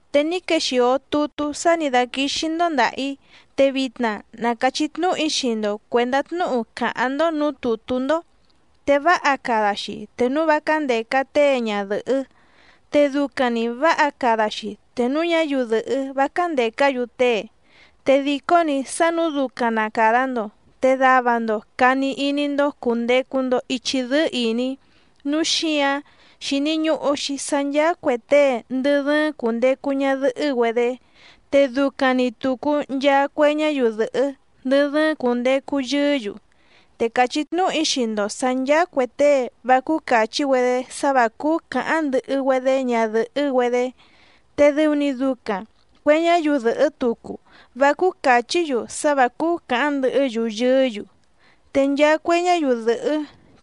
Te ní quexìo tutú sá nǐ dáquíxí‑ndó ndàha‑í, te vitna na càchí tnúhu‑í xii‑ndo cuèndá tnúhu càháⁿ‑ndó nǔú tùtú‑ndó. Te váha cada‑xi te núu vá cándèca tée ñadɨ̀hɨ́, te ducaⁿ‑ni vǎha cada‑xi te núu ñáyiu dɨ̀hɨ́ vá cándècá‑yu tée. Te dìcó‑ni sá nǔu ducaⁿ na càda‑ndo te dava‑ndo càni iní‑ndó cùndecu‑ndo ichi dɨ́ɨ́ ìní. Núu xíǎⁿ xíní ñùhu‑xi sá ncháá cuè tée ndɨ dɨ́ɨ́ⁿ cùndecu ñadɨhɨ́‑güedé, te ducaⁿ‑ni tùcu nchaa cue ñáyiu dɨ̀hɨ́ ndɨ dɨ́ɨ́ⁿ cùndecu yɨɨ́‑yu. Te càchí tnúhu‑í xii‑ndo sǎ ncháá cuè tée vá cúú càchí‑güedé sá vǎ cúú cǎháⁿ ndɨhɨ‑güedé ñadɨ̀hɨ́‑güedé, te dɨu‑ni ducaⁿ cuè ñáyiu dɨ̀hɨ́ tucu, vá cúú càchí‑yu sá vǎ cúú cǎháⁿ ndɨhɨ́‑yu yɨɨ́‑yu. Te nchaa cue ñáyiu dɨ̀hɨ́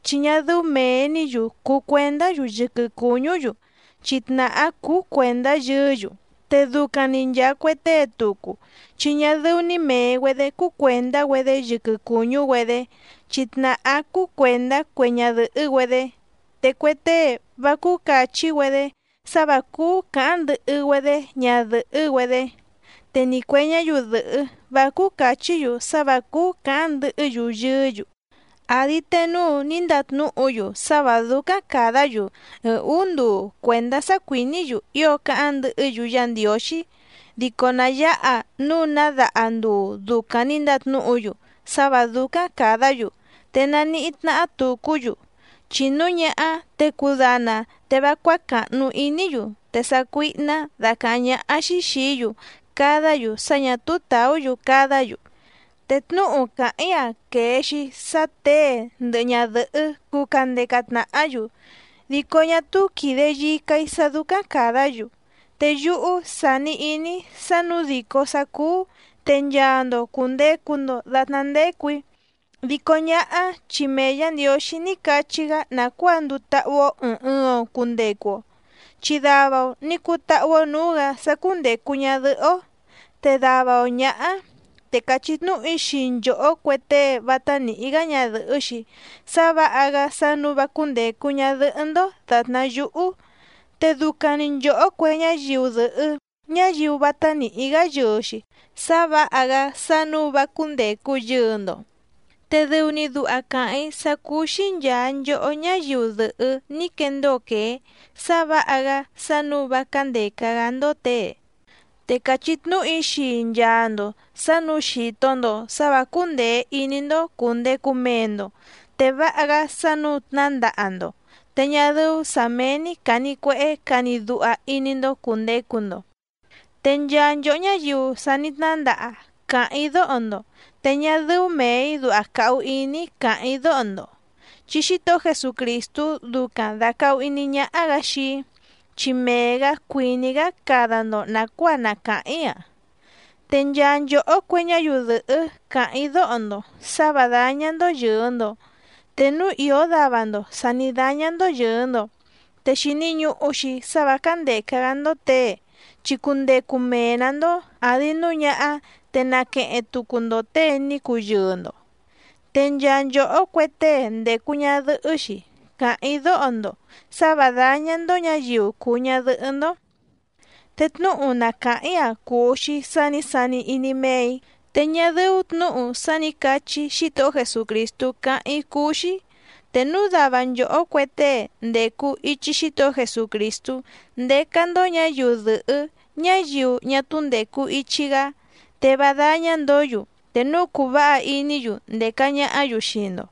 chi ñá dɨ́ú mèe‑ní‑yu cùu cuendá‑yu yɨquɨ cùñú‑yu chi tnàhá cúú cuèndá yɨɨ́‑yu, te ducaⁿ‑ni nchàa cue tée tucu chi ñá dɨ́ú‑ní mèe‑güedé cúú cuèndá‑güedé yɨquɨ cùñú‑güedé chi tnàhá cúú cuèndá cue ñadɨ̀hɨ́‑güedé. Te cue tée vá cúú càchí‑güedé sá vǎ cúú cǎháⁿ ndɨhɨ‑güedé ñadɨ̀hɨ́‑güedé. Te ni cuè ñáyiu dɨ̀hɨ́ vá cúú càchí‑yu sá vǎ cúú càháⁿ ndɨhɨ́‑yu yɨɨ́‑yu. Àdi te núu ní ndatnúhu‑yu sá vǎ dúcáⁿ càdá‑yu ɨɨⁿ ǔú nduu cuèndá sá cuìní‑yu ío cáháⁿ ndɨhɨ́‑yu Yá Ndiǒxí, dico nà yáha núu ná daha nduu ducaⁿ nǐ ndatnúhu‑yu sá vǎ dúcáⁿ càdá‑yu te naníhí tnáhá tùcú‑yu, chi núu ñáhá te cudana te vá cuácàhnu iní‑yu te sácuíhná dacàháⁿ ñáhá‑xí xìí‑yu cadá‑yu sá ñà túú tàú‑yu cadá‑yu. Te tnúhu càháⁿ‑í‑a quèe‑xi sá těe ndɨhɨ ñadɨ̀hɨ́ cuu candeca tnàhá‑yu dico ñá túú quìde yica‑í sá dúcáⁿ càdá‑yu. Te yúhú sání ìní‑í sá nǔu dìcó sá cúú te nchaa‑ndo cùndecu‑ndo datná ndécù‑í, dico ñáhá chi mee Yǎ Ndiǒxí ní cachí‑gá nàcuáa nduu táhú‑ó ɨ̀ɨⁿ ɨɨⁿ‑o cundecu‑o, chi dava‑o nǐ cutáhú‑ó nǔú‑gǎ sá cúndècu ñadɨhɨ́‑ó te dava‑o ñǎhá. Te càchí tnúhu‑í xii nchòhó cue tée vátá nìhí‑gá ñadɨ̀hɨ́‑xi sá vǎha‑gá sá nǔu vá cúndècu ñadɨhɨ́‑ndó dàtná yúhú. Te ducaⁿ‑ni nchòhó cue ñáyiu dɨ̀hɨ́ ñáyiu vátá nìhí‑gá yɨɨ‑xi sá vǎha‑gá sá nǔu vá cúndècu yɨɨ‑ndo. Te dɨu‑ni duha càháⁿ‑í sá cúú‑xí nchàa nchohó ñáyiu dɨ̀hɨ́ ní quendóo quèé sá vǎha‑gá sá nǔu vá cándèca‑gá‑ndó těe. Te càchí tnúhu‑í xii nchaa‑ndo sǎ nǔu xìto‑ndo sá vǎ cúndèe iní‑ndó cùndecu mee‑ndo te váha‑gá sá nǔu tnándaha‑ndo, te ñá dɨ́ú sǎ méé‑ní càni cuehé cani duha iní‑ndó cùndecu‑ndo. Te nchaa nchòhó ñáyiu sa ní tnándaha càháⁿ‑í dóho‑ndo, te ñá dɨ́ú mèe‑í duha càhu iní‑í càháⁿ‑í dóho‑ndo chi Xítohó Jesucrìstú ducaⁿ dàcahu iní ñáhá‑gǎ xii‑í, chi mee‑gǎ cuìní‑gá cada‑ndo nàcuáa na càháⁿ‑í‑a. Te nchaa nchòhó cue ñáyiu dɨ̀hɨ́ càháⁿ‑í dóho‑ndo sǎ vǎ dáñá‑ndó yɨ̀ɨ‑ndo. Te núu ìó dava‑ndo sà ní dáñá‑ndó yɨ̀ɨ‑ndo, te xìni ñuhu‑xi sá vǎ cándèca‑gá‑ndó těe, chi cundecu mee‑nǎ‑ndó àdi núu ñáhá te naqueheⁿ tucu‑ndo těe ní cuu yɨɨ‑ndo. Te nchaa nchòhó cue tée ndècu ñadɨhɨ́‑xi càháⁿ‑í dóho‑ndo sǎ vǎ dáñá‑ndó ñǎyiu cùu ñadɨhɨ́‑ndó. Te tnúhu na càháⁿ‑í‑a cùu‑xi sá nǐ sani iní méè‑í te ñá dɨ́ú tnǔhu sá nǐ cachí Xítohó Jesucrìstú cáháⁿ‑í cúú‑xí. Te núu dava nchòhó cue tée ndècu ichi Xítohó Jesucrìstú ndécá‑ndó ñǎyiu dɨ̀hɨ́ ñáyiu ñá túú ndècu ichi‑gá, te vá dáñá‑ndǒ‑yu te núu cùu váha iní‑yu ndèca ñahá‑yu xii‑ndo.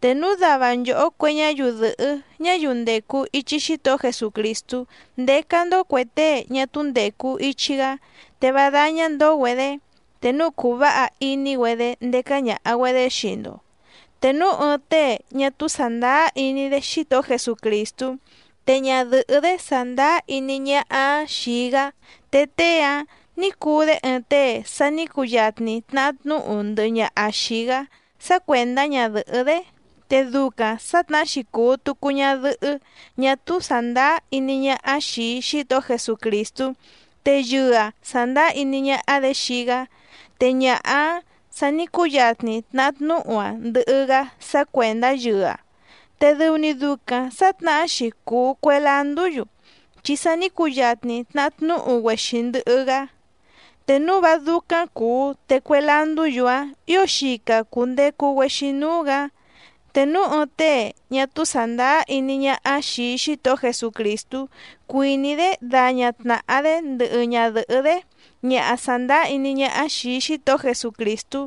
Te núu dava nchòhó cue ñáyiu dɨ̀hɨ́ ñáyiu ndècu ichi Xítohó Jesucrìstú ndécá‑ndó cuè tée ñá túú ndècu ichi‑gá te vá dáñá‑ndó‑güedě te núu cùu váha iní‑güedé ndécá ñàha‑güedé xii‑ndo. Te núu ɨɨⁿ tée ñá túú sàndáá iní‑dé Xítohó Jesucrìstú te ñadɨ̀hɨ́‑dé sàndáá iní ñáhá‑áⁿ xìi‑gá, te tée‑áⁿ nǐ cuu‑dé ɨɨⁿ tée sa ní cuyatni tnahá tnúhu ndɨhɨ ñaha xìi‑gá sá cuèndá ñadɨ̀hɨ́‑dé. Te ducaⁿ sǎtnahá‑xi cùu tucu ñadɨhɨ́ ñá túú sàndáá iní ñáhá xìi Xítohó Jesucrìstú te yɨɨ‑aⁿ sàndáá iní ñáhá‑dě xii‑gá, te ñaha‑áⁿ sa ní cuyatni tnahá tnúhu‑aⁿ ndɨhɨ‑gá sá cuèndá yɨɨ‑aⁿ, te dɨu‑ni ducaⁿ sǎtnahá‑xi cùu cue landú‑yu chi sa ní cuyatni tnahá tnúhu‑güexi ndɨhɨ‑gá. Te núu vá dúcáⁿ cùu te cue landú‑yu‑áⁿ ǐo xica cùndecu‑güexi núú‑gǎ. Te núu ɨɨⁿ tée ñá túú sàndáá iní ñáhá xìi Xítohó Jesucrìstú cuìní‑dé daña tnàha‑dé ndɨhɨ ñadɨ̀hɨ́‑dé ñaha sàndáá iní ñáhá xìi Xítohó Jesucrìstú,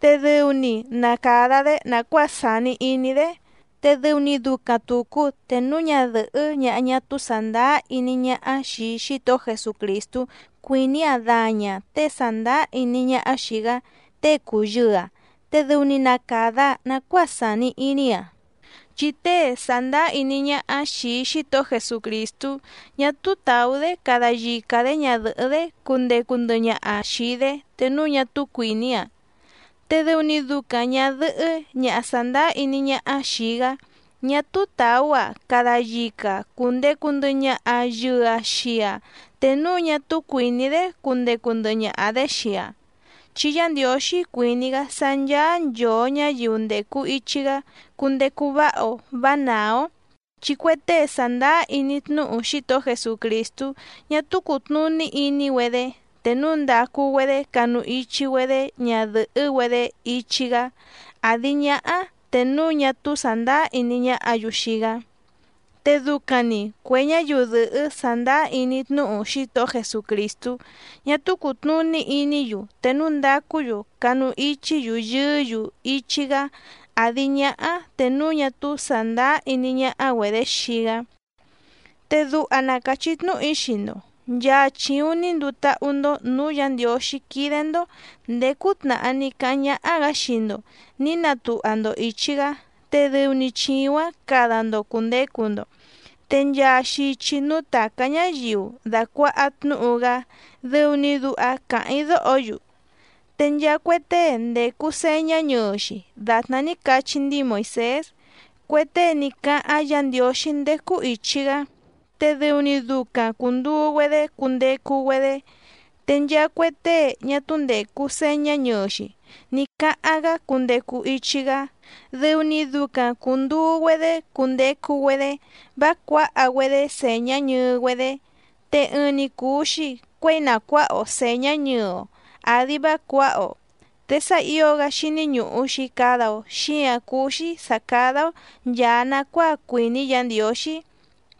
te dɨu‑ni na càda‑dé nàcuáa sàni iní‑dé. Te dɨu‑ni ducaⁿ tùcu te núu ñadɨ̀hɨ́ ñaha ñá túú sàndáá iní ñáhá xìi Xítohó Jesucrìstú cuìní‑aⁿ daña‑aⁿ těe sàndáá iní ñáhá xìi‑gá, tée cùu yɨɨ‑aⁿ te dɨu‑ni na càda‑aⁿ nacuáa sàni iní‑aⁿ. Chi tée sàndáá iní ñáhá xìi Xítohó Jesucrìstú ñá túú tàú‑dé cada yica‑dě ñadɨ̀hɨ́‑dé cundecu ndɨhɨ ñaha‑aⁿ xìi‑dé te núu ñá túú cuìní‑aⁿ. Te dɨu‑ni ducaⁿ ñàdɨhɨ́ ñaha sàndáá iní ñáhá xìi‑gá ñá túú tàú‑aⁿ cada yica‑aⁿ cùndecu ndɨhɨ ñaha yɨɨ‑aⁿ xii‑aⁿ te núu ñá túú cuìní‑dé cundecu ndɨhɨ ñaha‑dě xii‑aⁿ, chi Yá Ndiǒxí cuìní‑gá sá ncháá nchòo ñáyiu ndècu ichi‑gá cundecu váha‑o vǎ nàá‑ó. Chi cue tée sàndáá iní tnúhu Xítohó Jesucrìstú ñá túú cùtnuní iní‑güedé te núu ndacu‑güedé canu ichi‑güedé ñadɨ̀hɨ́‑güedé ichi‑gá àdi ñáhá te núu ñá túú sàndáá iní ñáhǎ‑yu xii‑gá, te ducaⁿ‑ni cuè ñáyiu dɨ̀hɨ́ sàndáá iní tnúhu Xítohó Jesucrìstú ñá túú cùtnuní iní‑yu te núu ndacú‑yu canu ichí‑yu yɨɨ́‑yu ichi‑gá àdi ñáhá te núu ñá túú sàndáá iní ñáhá‑güedě xii‑gá. Te duha na càchí tnúhu‑í xii‑ndo, nchaa chìuⁿ ní nduu táhú‑ndó nǔú Yǎ Ndiǒxí quídé‑ndó ndèé cútnàhá ní cáháⁿ ñáhá‑gǎ xii‑ndo nǐ natuha‑ndo ìchi‑gá te dɨu‑ni chìuⁿ‑áⁿ cada‑ndo cùndecu‑ndo. Te nchaa xichi núú tàcá ñáyiu dàcuaha tnúhu‑gá dɨu‑ni duha càháⁿ‑í dóho‑yu. Te nchaa cue tée ndècu señá ñɨɨ‑xi dàtná ní cachi ndíi Moìsés, cue tée ní cáháⁿ Yǎ Ndiǒxí ndécú ìchi‑gá, te dɨu‑ni ducaⁿ cùnduu‑güedé cundecu‑güedé, te nchaa cue tée ñá túú ndècu señá ñɨɨ‑xi ní cáháⁿ‑gá cundecu ichi‑gá, dɨu‑ni ducaⁿ cùnduu‑güedé cundecu‑güedé vá cuǎha‑güedé sèñá ñɨɨ‑güedé. Te ɨɨⁿ‑ni cùu‑xi cuéi na cuǎha‑o sèñá ñɨɨ‑o àdi vá cuǎha‑o. Te sá ǐo‑gá xíní ñùhu‑xi cada‑o xíǎⁿ cúú‑xí sǎ cádá‑ó nchàa nacuáa cuìní Yǎ Ndiǒxí.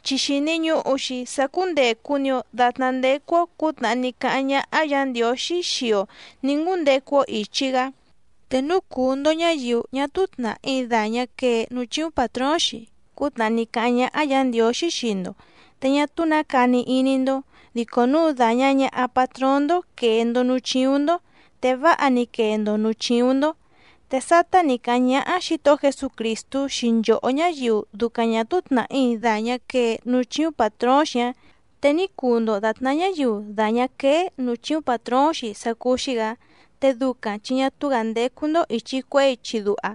Chi xìni ñuhu‑xi sá cúndècu‑ni‑o datná ndécú‑ó cǔtnàhá ní cáháⁿ ñáhá Yǎ Ndiǒxí xii‑o nǐ ngúndecu‑o ìchi‑gá. Te núu cùu‑ndo ñáyiu ñá túú tnàhí dàñá quee núú chíúⁿ pàtróóⁿ‑xi cútnàhá ní cáháⁿ ñáhá Yǎ Ndiǒxí xii‑ndo, te ñá túú nǎ cani iní‑ndó, dico núu dàña ñaha patróóⁿ‑ndó quèe‑ndo núú chíúⁿ‑ndó te váha‑ni quee‑ndo nǔú chíúⁿ‑ndó. Te sátá nǐ cáháⁿ ñáhá Xǐtohó Jesucrìstú xii nchòhó ñáyiu ducaⁿ ñà túú tnàhí dàñá quee núú chíúⁿ pàtróóⁿ‑xi‑áⁿ, te ní cuu‑ndo dàtná ñáyiu dàñá quéé nǔú chíúⁿ pàtróóⁿ‑xi sá cúú‑xí‑gǎ, te ducaⁿ chi ñá túú‑gǎ ndécú‑ndó ìchi cuehé ichi duha.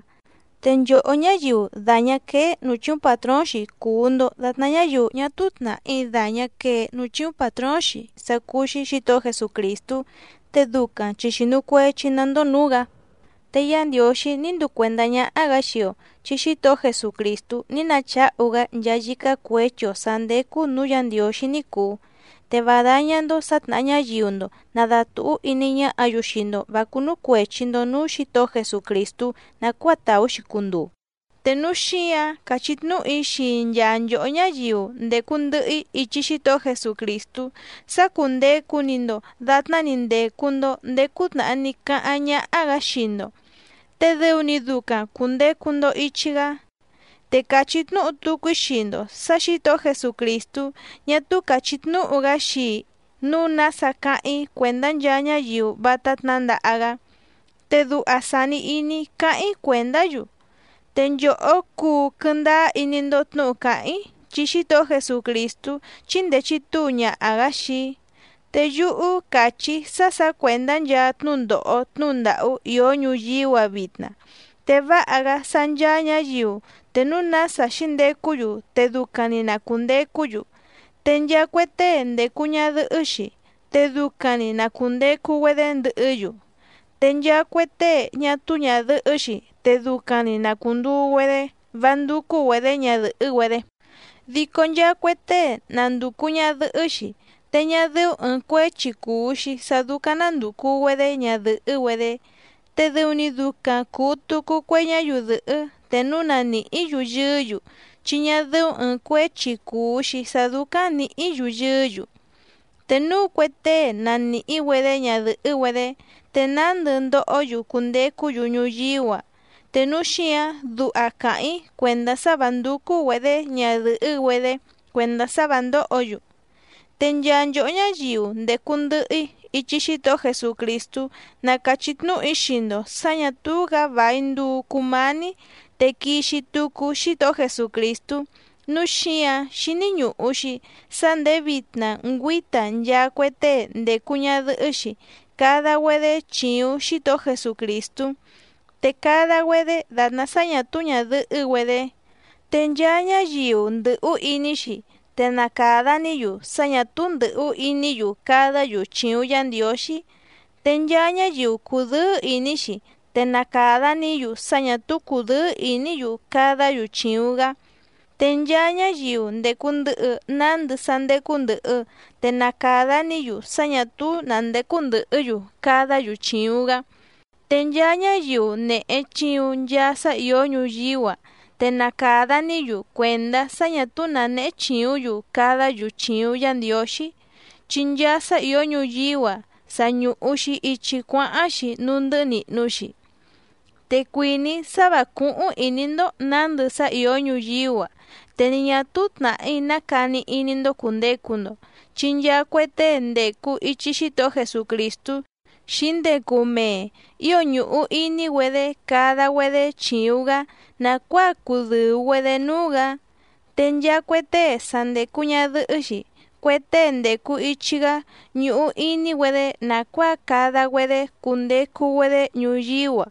Te nchòhó ñáyiu dàñá quéé nǔú chíúⁿ pàtróóⁿ‑xi cùu‑ndo datná ñáyiu ñá túú tnàhí dàñá quee núú chíúⁿ pàtróóⁿ‑xi sá cúú‑xí Xǐtohó Jesucrìstú, te ducaⁿ chi xìnu cuechi‑ná‑ndó nǔú‑gǎ. Te Yá Ndiǒxí ní nduu cuèndá ñáhá‑gǎ xii‑o chi Xítohó Jesucrìstú ní nacháhu‑gá nchaa yícá cuěchi‑o sǎ ndécú nǔú Yǎ Ndiǒxí ní cùu, te vá dáñá‑ndó sǎ tnàha ñáyiu‑ndo nàdatuhú iní ñáhǎ‑yu xii‑ndo vǎ cúnú cuèchi‑ndo núú Xǐtohó Jesucrìstú nàcuáa tàú‑xi cunduu. Te núu xíǎⁿ càchí tnúhu‑í xii nchaa nchòhó ñáyiu ndècu ndɨhɨ‑í ichi Xítohó Jesucrìstú sá cúndècu‑ni‑ndo datná‑ni ndècu‑ndo ndéé cútnàhá ní cáháⁿ ñáhá‑gǎ xii‑ndo, te dɨu‑ni ducaⁿ cùndecu‑ndo ichi‑gá. Te càchí tnúhu tucu‑í xii‑ndo sǎ Xǐtohó Jesucrìstú ñá túú càchí tnúhu‑gá xii‑í nǔu nása cáháⁿ‑í cuèndá nchaa ñáyiu vátá tnǎndaha‑gá. Te duha sàni iní‑í cáháⁿ‑í cuèndá‑yu, te nchòhó cuu quɨ́ndáá iní‑ndó tnǔhu càháⁿ‑í chi Xítohó Jesucrìstú chíndèe chitúu ñaha‑gǎ xii‑í. Te yúhú càchí‑í sá sǎ cuèndá nchaa tnúndòho tnúhu ndàhú ìó ñuyíú‑a vitna, te váha‑gá sá ncháá ñǎyiu te núu nása xǐndecú‑yu te ducaⁿ‑ni na cùndecú‑yu. Te nchaa cue tée ndècu ñadɨhɨ́‑xi te ducaⁿ‑ni na cùndecu‑güedé ndɨhɨ́‑yu, te nchaa cue tée ñá túú ñàdɨhɨ́‑xi te ducaⁿ‑ni na cùnduu‑güedé vá ndúcú‑güedě ñadɨ̀hɨ́‑güedé. Dico nchaa cue tée na ndùcu ñadɨhɨ́‑xi te ñá dɨ́ú ɨ̀ɨⁿ cuéchi cùu‑xi sá dúcáⁿ ná ndùcu‑güedé ñadɨ̀hɨ́‑güedé, te dɨu‑ni ducaⁿ cùu tucu cue ñáyiu dɨ̀hɨ́ te núu na nìhí‑yu yɨɨ́‑yu chi ñá dɨ́ú ɨ̀ɨⁿ cuéchi cùu‑xi sá dúcáⁿ nǐhǐ‑yu yɨɨ́‑yu. Te núu cue tée na nìhí‑güedé ñadɨ̀hɨ́‑güedé te nándɨ ndohó‑yu cundecú‑yu ñuyíú‑a, te núu xíǎⁿ duha càháⁿ‑í cuèndá sá vǎ ndúcú‑güedě ñadɨ̀hɨ́‑güedé cuèndá sá vǎ ndóhǒ‑yu. Te nchaa nchòhó ñáyiu ndècu ndɨhɨ‑í ichi Xítohó Jesucrìstú na càchí tnúhu‑í xii‑ndo sǎ ñǎ túú‑gǎ vài nduu cumání te quixi tucu Xítohó Jesucrìstú, núu xíǎⁿ xíní ñùhu‑xi sá ndèé vitna ngüíta nchaa cue tée ndècu ñadɨhɨ́‑xi cada‑güedé chìuⁿ Xítohó Jesucrìstú, te cada‑güedé dàtná sá ñà túú ñàdɨhɨ́‑güedé. Te nchaa ñáyiu ndɨ̀hú iní‑xi te na càda‑ní‑yu sá ñà túú ndɨ̀hú iní‑yu cadá‑yu chìuⁿ Yá Ndiǒxí. Te nchaa ñáyiu cùdɨ́ɨ́ ìní‑xi te na càda‑ní‑yu sá ñà túú cùdɨ́ɨ́ ìní‑yu cadá‑yu chìuⁿ‑gá, te nchaa ñáyiu ndècu ndɨhɨ nándɨ sá ndécú ndɨ̀hɨ te na càda‑ní‑yu sá ñà túú nǎ ndécú ndɨ̀hɨ́‑yu cadá‑yu chìuⁿ‑gá. Te nchaa ñáyiu nèhe chiuⁿ nchaa sá ìó ñuyíú‑a te na càda‑ní‑yu cuèndá sá ñà túú nǎ néhé chìúⁿ‑yu cadá‑yu chìuⁿ Yá Ndiǒxí, chi nchaa sá ìó ñuyíú‑a sa ñùhu‑xi ichi cuáháⁿ‑xi núú ndɨ́hɨ́ nìhnu‑xi. Te cuìní‑í sá vǎ cúhúⁿ ìní‑ndó nǎndɨ sá ìó ñuyíú‑a, te ni ñà túú tnàhí ná cani iní‑ndó cùndecu‑ndo, chi nchaa cue tée ndècu ichi Xítohó Jesucrìstú xǐndecu mee ío ñùhu iní‑güedé cada‑güedé chìuⁿ‑gá nàcuáa cudɨ̀u‑güedé núú‑gǎ. Te nchaa cue tée sa ndècu ñadɨhɨ́‑xi cue tée ndècu ichi‑gá ñùhu iní‑güedé nàcuáa cada‑güedé cundecu‑güedé ñuyíú‑a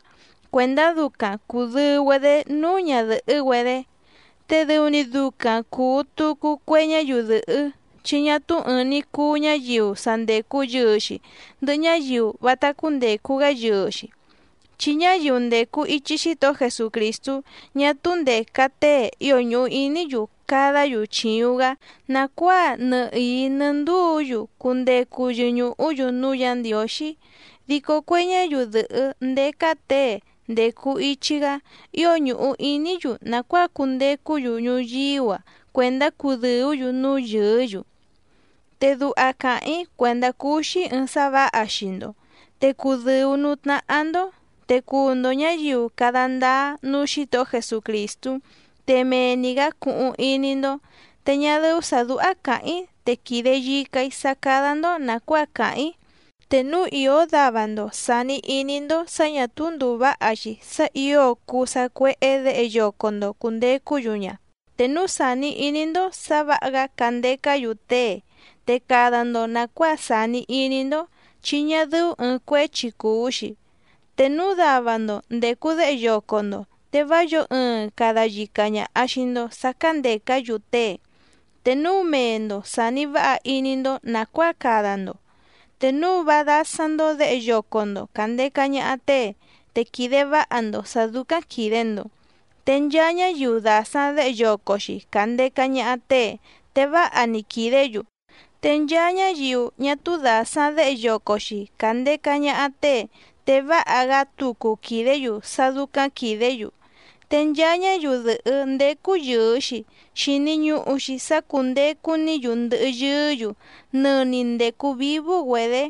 cuèndá ducaⁿ cùdɨu‑güedé núú ñadɨ̀hɨ́‑güedé. Te dɨu‑ni ducaⁿ cùu tucu cue ñáyiu dɨ̀hɨ́ chi ñá túú ɨ̀ɨⁿ‑ni cuu ñáyiu sa ndècu yɨɨ‑xi ndɨhɨ ñáyiu vátá cúndècu‑gá yɨɨ‑xi, chi ñáyiu ndècu ichi Xítohó Jesucrìstú ñá túú ndèca tée ío ñùhu iní‑yu cadá‑yu chìuⁿ‑gá nàcuáa nɨhìí nɨ́ ndúǔ‑yu cundecu yɨñùhú‑yu núú Yǎ Ndiǒxí, dico cue ñáyiu dɨ̀hɨ́ ndécá těe ndècu ichi‑gá ío ñùhu iní‑yu nàcuáa cundecú‑yu ñuyíú‑a cuèndá cudɨ̀ú‑yu núú yɨɨ́‑yu. Te duha càháⁿ‑í cuèndá cúú‑xí ɨ̀ɨⁿ sá vǎha xii‑ndo, te cudɨ̀u núú tnáhá‑ndó, te cuu‑ndo ñǎyiu cada ndáá núú Xǐtohó Jesucrìstú, te mee‑ni‑gǎ cuhuⁿ iní‑ndó. Te ñá dɨ́ú sǎ dúhá càháⁿ‑í te quìde yica‑í sá cádá‑ndó nàcuáa càháⁿ‑í. Te núu ìó dava‑ndo sàni iní‑ndó sǎ ñà túú ndùu váha‑xi sá ǐo cuu sacuéhé děhe yoco‑ndo cùndecú‑yu ña, te núu sàni iní‑ndó sǎ vǎha‑gá candecá‑yu tée te cada‑ndo nàcuáa sàni iní‑ndó, chi ñá dɨ́ú ɨ̀ɨⁿ cuéchi cùu‑xi. Te núu dava‑ndo ndècu déhe yoco‑ndo, te vá yǒo ɨɨⁿ cada yica ñàha xii‑ndo sá cándècá‑yu tée. Te núu mee‑ndo sàni váha iní‑ndó nàcuáa cada‑ndo, te núu vá dásáⁿ‑ndó děhe yoco‑ndo càndeca ñaha tée te quìde váha‑ndo sǎ dúcáⁿ quìde‑ndo. Te nchaa ñáyiu dàsaⁿ déhe yoco‑xi càndeca ñaha tée te váha‑ni quìdé‑yu, te nchaa ñáyiu ñá túú dàsaⁿ déhe yoco‑xi càndeca ñaha tée te váha‑gá tucu quìdé‑yu sá dúcáⁿ quìdé‑yu. Te nchaa ñáyiu dɨ̀hɨ́ ndécú yɨ̀ɨ‑xi xini ñuhu‑xi sá cúndècu‑ní‑yu ndɨhɨ yɨɨ́‑yu nɨni ndècu vívú‑güedě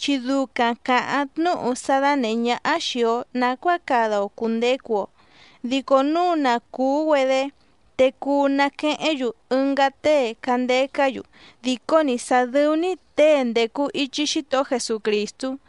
chi ducaⁿ càháⁿ tnúhu sá dánèhé ñáhá xìi‑o nacuáa cada‑o cùndecu‑o, dico núu na cùú‑güedé te cuu naquehéⁿ‑yu ɨngá tée candecá‑yu dìcó‑ni sá dɨ̀u‑ni tée ndècu ichi Xítohó Jesucrìstú.